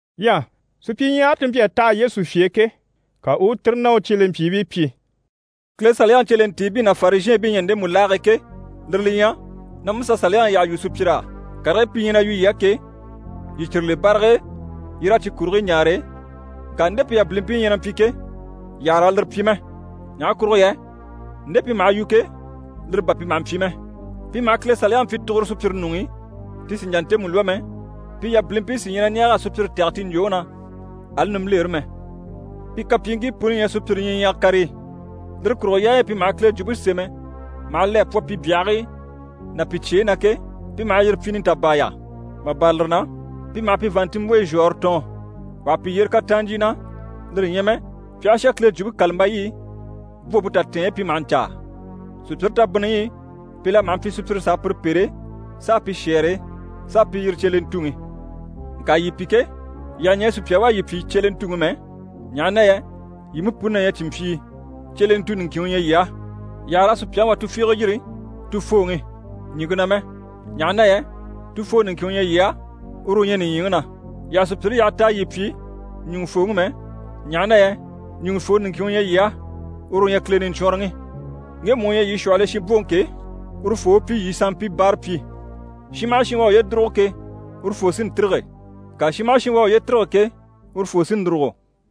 Ɲyɛ supyiɲyahare ti mpyi a taha Yesu fye e ke, ka u u tire ná u cyelempyiibii pyi: «Kile Saliyaŋi cyelentiibii ná Farizhɛɛnbii ɲyɛ ndemu laage e ke, lire li ɲyɛ: na Musa Saliyaŋi yyaha yu sùpyir'á. Karigii pi ɲyɛ na yu yii á ke, yii cyire le barag'e yii raa cyi kurigii ɲaare, ŋka nde pi yabilimpii ɲyɛ na mpyi ke, yii àha raa lire pyi mɛ. Ɲaha kurugo yɛ nde pi maha yu ke, lire bà pi maha mpyi mɛ. Pi maha Kile Saliyaŋi pyi tuguro sùpyire ɲuŋ'i, ti sì n‑jà ntemu lwɔ́ mɛ, pi yabilimpii sí ɲyɛ na ɲɛɛg'a sùpyire tɛ̀gɛ ti ɲjwòŋi na, ali nimbilere mɛ. Pi kapyiiŋkii puni ɲyɛ sùpyire ɲyiɲyaga karigii. Lire kurugo yaayi i pi maha Kile Jwumpe sémɛ maha le a pwɔ pi byahigii ná pi cyeyi na ke, pi maha yire pyi nitabaaya. Mà bâra lire na, pi maha pi vàanntinmbwoyi zhwɔ̀ɔnre tɔɔn. Wà ha pi yyere kataan ɲjyì na, lire ɲyɛ mɛ pi aha shà Kile Jwumpe kàlambayi i, bwompe tatɛɛnyi pi maha ɲcaa. Sùpyire tabinniyi i, pi la maha mpyi sùpyire s'a pire pêre s'a pi shɛ́ɛre, s'a pi yiri “Cyelentuŋi”. Ŋka yii pi ke, yii àha ɲɛɛ sùpya u a yii pyi “Cyelentuŋi” mɛ, ɲaha na yɛ yii mú puni na ɲyɛ cìnmpyii, Cyelentu niŋkin u ɲyɛ yii á. Yii àha raa sùpyaŋi wà tufiige yiri “Tufooŋi” ɲìŋke na mɛ, ɲaha na yɛ Tufoo niŋkin u ɲyɛ yii á, uru u ɲyɛ nìɲyiŋi na. Yii àha sùpyire yaha t'a yii pyi “Ɲùŋufooŋi” mɛ, ɲaha na yɛ Ɲùŋufoo niŋkin u ɲyɛ yii á, uru u ɲyɛ Kile Niɲcwɔnrɔŋi. Ŋgemu u ɲyɛ yii shwɔhɔl'e shinbwoŋi ke, urufoo u pyi yii sanmpii báarapyi. Shin maha shin u à uye dùrugo ke, urufoo sí n‑tîrige, ŋka shin maha shin u à uye tîrige ke, urufoo sí n‑dùrugo.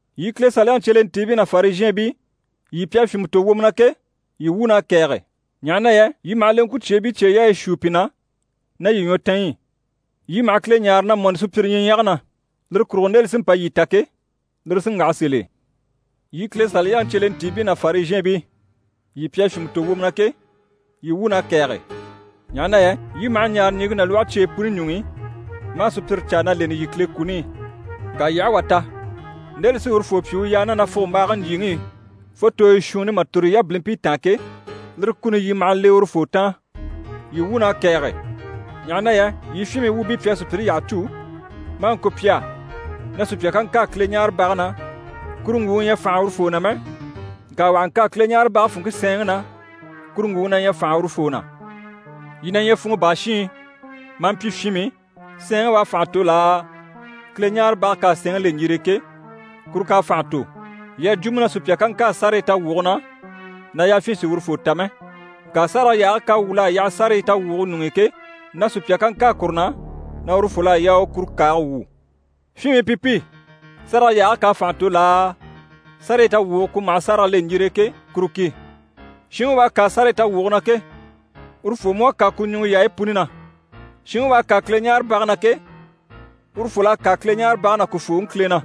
Yii Kile Saliyaŋi cyelentiibii ná Farizhɛɛnbii, yii pi à fyìnmɛ tò wwomɔ na ke, yii wuun'à kɛ̀ɛge! Ɲaha na yɛ yii maha leŋkwucyeebii cyeyaayi shuu pi na ná yii ɲwɔtanyi i. Yii maha Kile ɲáare na mɔni sùpyire ɲyiɲyage na. Lire kurugo nde li sí n‑pa yii ta ke, lire sí n‑waha sèl'e.] Yii Kile Saliyaŋi cyelentiibii ná Farizhɛɛnbii, yii pi à fyìnmɛ tò wwomɔ na ke, yii wuun'à kɛ̀ɛge! Ɲaha na yɛ yii maha ɲaare ɲìŋke ná lwɔhe cyeyi puni ɲuŋ'i, maa sùpyire caa na lèŋi yii Kile kuni i. Ŋka yii aha wà ta, nde li sí urufoo pyi u yaa ná nafugombaage ɲjyìŋi i fo tooyi shuunni mà tòro yii yabilimpii taan ke, lire kuni yii maha le urufoo taan. Yii wuun'à kɛ̀ɛge! Ɲaha na yɛ yii fyinmii wuubii pi à sùpyire yyaha cû, maa ŋko pi á na sùpya ká ŋkâa Kileɲaarebage na, kuru ŋgwùŋi ɲyɛ fànha urufoo na mɛ, ŋka wà ha ŋkâa Kileɲaarebage funŋke sɛɛnŋi na, kuru ŋgwùŋi na ɲyɛ fànha urufoo na. Yii na ɲyɛ funŋɔ baa shiin maa mpyi fyinmii, sɛɛnŋi u à fànha tò laa, Kileɲaarebage k'à sɛɛnŋi le ɲjire e ke, kuru k'à fànha tò? Yii à jwo mú na sùpya ká ŋkâa sárayi tawwuge na, na yafyin sì urufoo ta mɛ, ŋka sárage yaage k'à wwûl'a yaha sárayi tawwuge ɲuŋ'i ke, na sùpya ká ŋkâa kuru na, na urufol'à yaa u kuru kàage wwû. Fyinmii pi pi! Sárage yaage k'à fànha tò laa, sárayi tawwuge ku maha sárage le ɲjire e ke, kuru ki? Shinŋi u à kâa sárayi tawwuge na ke, urufoo mú à kâa ku ɲùŋɔ yaayi puni na. Shinŋi u à kâa Kileɲaarebage na ke, urufol'à kâa Kileɲaarebage ná ku fooŋi Kile na.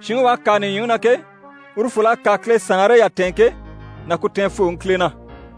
Shinŋi u à kâa nìɲyiŋi na ke, urufol'à kâa Kile saanre yatɛɛnŋke ná ku tɛɛnfooŋi Kile na.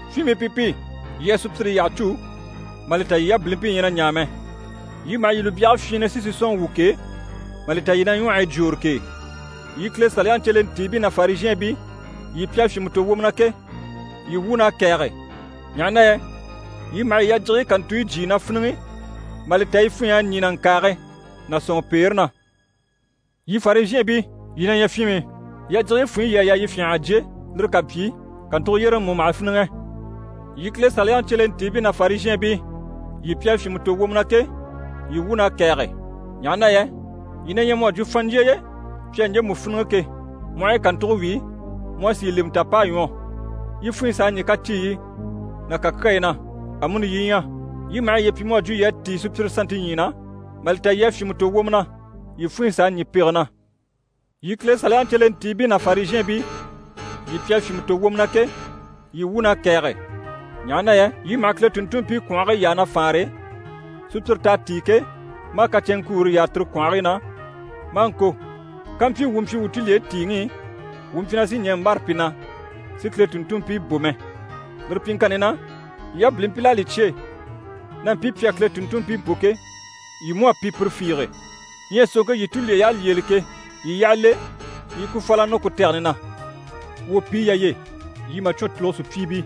Fyinmii pi pi! Yii à sùpyire yyaha cû mà li ta yii yabilimpii ɲyɛ na ɲaa mɛ. Yii maha yii lùbyage fyiinnɛ si sisɔnŋi wwû k'e, mà li ta yii na ɲwɔhɔyi jwoore k'e! Yii Kile Saliyaŋi cyelentiibii ná Farizhɛɛnbii, yii pi à fyìnmɛ tò wwomɔ na ke, yii wuun'à kɛ̀ɛge! Ɲaha na yɛ yii maha yii yajigiyi kàntuyi jyíi na fíniŋi, mà li ta yi funɲy'à ɲî nàŋkaage ná sɔ̀nŋɔpeere na. Yii Farizhɛɛnbii, yii na ɲyɛ fyinmii! Yajigiyi funɲyi yii à yaa yii fyânha a jyé, lire ká mpyi, kàntugo yyéreŋi mú maha fíniŋɛ. Yii Kile Saliyaŋi cyelentiibii ná Farizhɛɛnbii, yii pi à fyìnmɛ tò wwomɔ na ke, yii wuun'à kɛ̀ɛge! Ɲaha na yɛ yii na ɲyɛ mu à jwo fanɲjyeye, pi à ɲjemu fíniŋɛ ke, mu aha yi kàntuge wíi, mu a sì yi lemɛ ta p'à ɲwɔ, yi funŋke s'à ɲî kaciiyi ná kàkyayi na. Amuni yii ɲyɛ, yii maha yiye pyi mu à jwo yii à tíi sùpyire sannte ɲyii na, mà li ta yii à fyìnmɛ tò wwomɔ na, yii funɲyi s'à ɲî pege na. Yii Kile Saliyaŋi cyelentiibii ná Farizhɛɛnbii, yii pi à fyìnmɛ tò wwomɔ na ke, yii wuun'à kɛ̀ɛge! Ɲaha na yɛ yii maha Kile tùnntunmpii kwɔ̀nhigii yaa na faanre, sùpyire t'à tíi ke, maa kacɛnŋkuure yaa tire kwɔ̀nhigii na, maa ŋko “Kampyi wuu mpyi wuu tulyeyi tìiŋi i, wuu mpyi na sì ɲɛɛ n‑bâra pi na si Kile tùnntunmpii bò mɛ.” Lire pyiŋkanni na, yii yabilimpil'à li cyêe na mpii pi à Kile tùnntunmpii bò ke, yii mú à pi pire fiige. Ɲyɛ sòŋke yii tulyey'à lyêele ke, yii yyaha le yii i ku fàl'a nɔ ku tɛgɛni na! Wwòpiyi yà ye! Yii màcwɔn tùlugo sùpyiibii!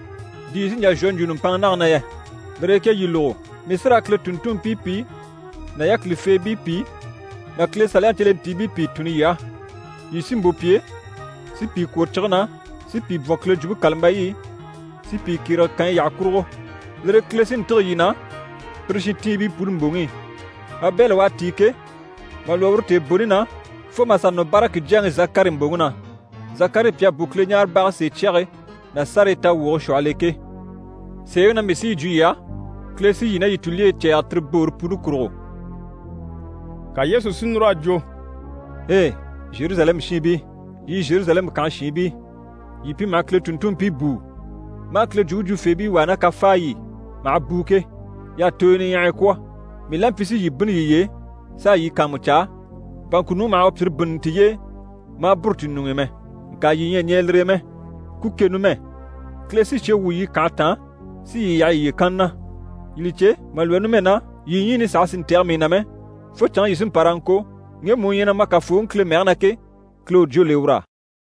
Di yii sí n‑jà n‑shwɔ n‑jwo nùmpanŋa nage na yɛ? Lire e ke yii lógo, mii sí raa Kile tùnntunmpii pìi ná yákilifeebii pìi ná Kile Saliyaŋi cyelentiibii pìi tunni yii á. Yii sí n‑bò pi e, si pìi kwòro cige na, si pìi bwɔ̀n Kile Jwumpe kàlambayi i, si pìi kyérege kànyi yyaha kurugo. Lire e Kile sí n‑tîge yii na pire shintiibii puni mbòŋi i: Abɛli u à tíi ke, mà lwɔ́ uru tèeboni na, fo mà sà nɔ Baraki jyaŋi Zakari mbòŋi na, Zakari pi à bò Kileɲaarebage sèecyage ná sárayi tawwuge shwɔhɔl'e ke. Sèeŋi na mii sí yi jwo yii á, Kile sí yii ná yii tulyeyi cɛ̂ɛgɛ tire boore puni kurugo.» Ka Yesu si núr'a jwo: «Ei! Zheruzalɛmu shiinbii, yii Zheruzalɛmu kànhe shiinbii, yii pi maha Kile tùnntunmpii bùu, maa Kile jwumpe jwufeebii wàa ná kafaay'i maha bùu ke, y'à tooyo niɲyahaya kwɔ̀ mii la mpyi si yii bínni yiye e s'a yii kàanmucaa, bà ŋkùnuŋi maha u pyìre bínni tiye e, maa bûru ti ɲuŋ'i mɛ. Ŋka yii ɲyɛ a ɲɛɛ lire e mɛ. Ku ke numɛ! Kile sí cye wwû yii kànhe taan si yii yaha yiye kanna na. Yii li cè, mà lwɔ́ numɛ na, yii ɲyiini saha sì n‑tɛ̀gɛ mii na mɛ, fo canŋke yii sí n‑pa raa ŋko “Ŋgemu u ɲyɛ na ma Kafooŋi Kile mɛge na ke, Kile u jwó le ur'á.”»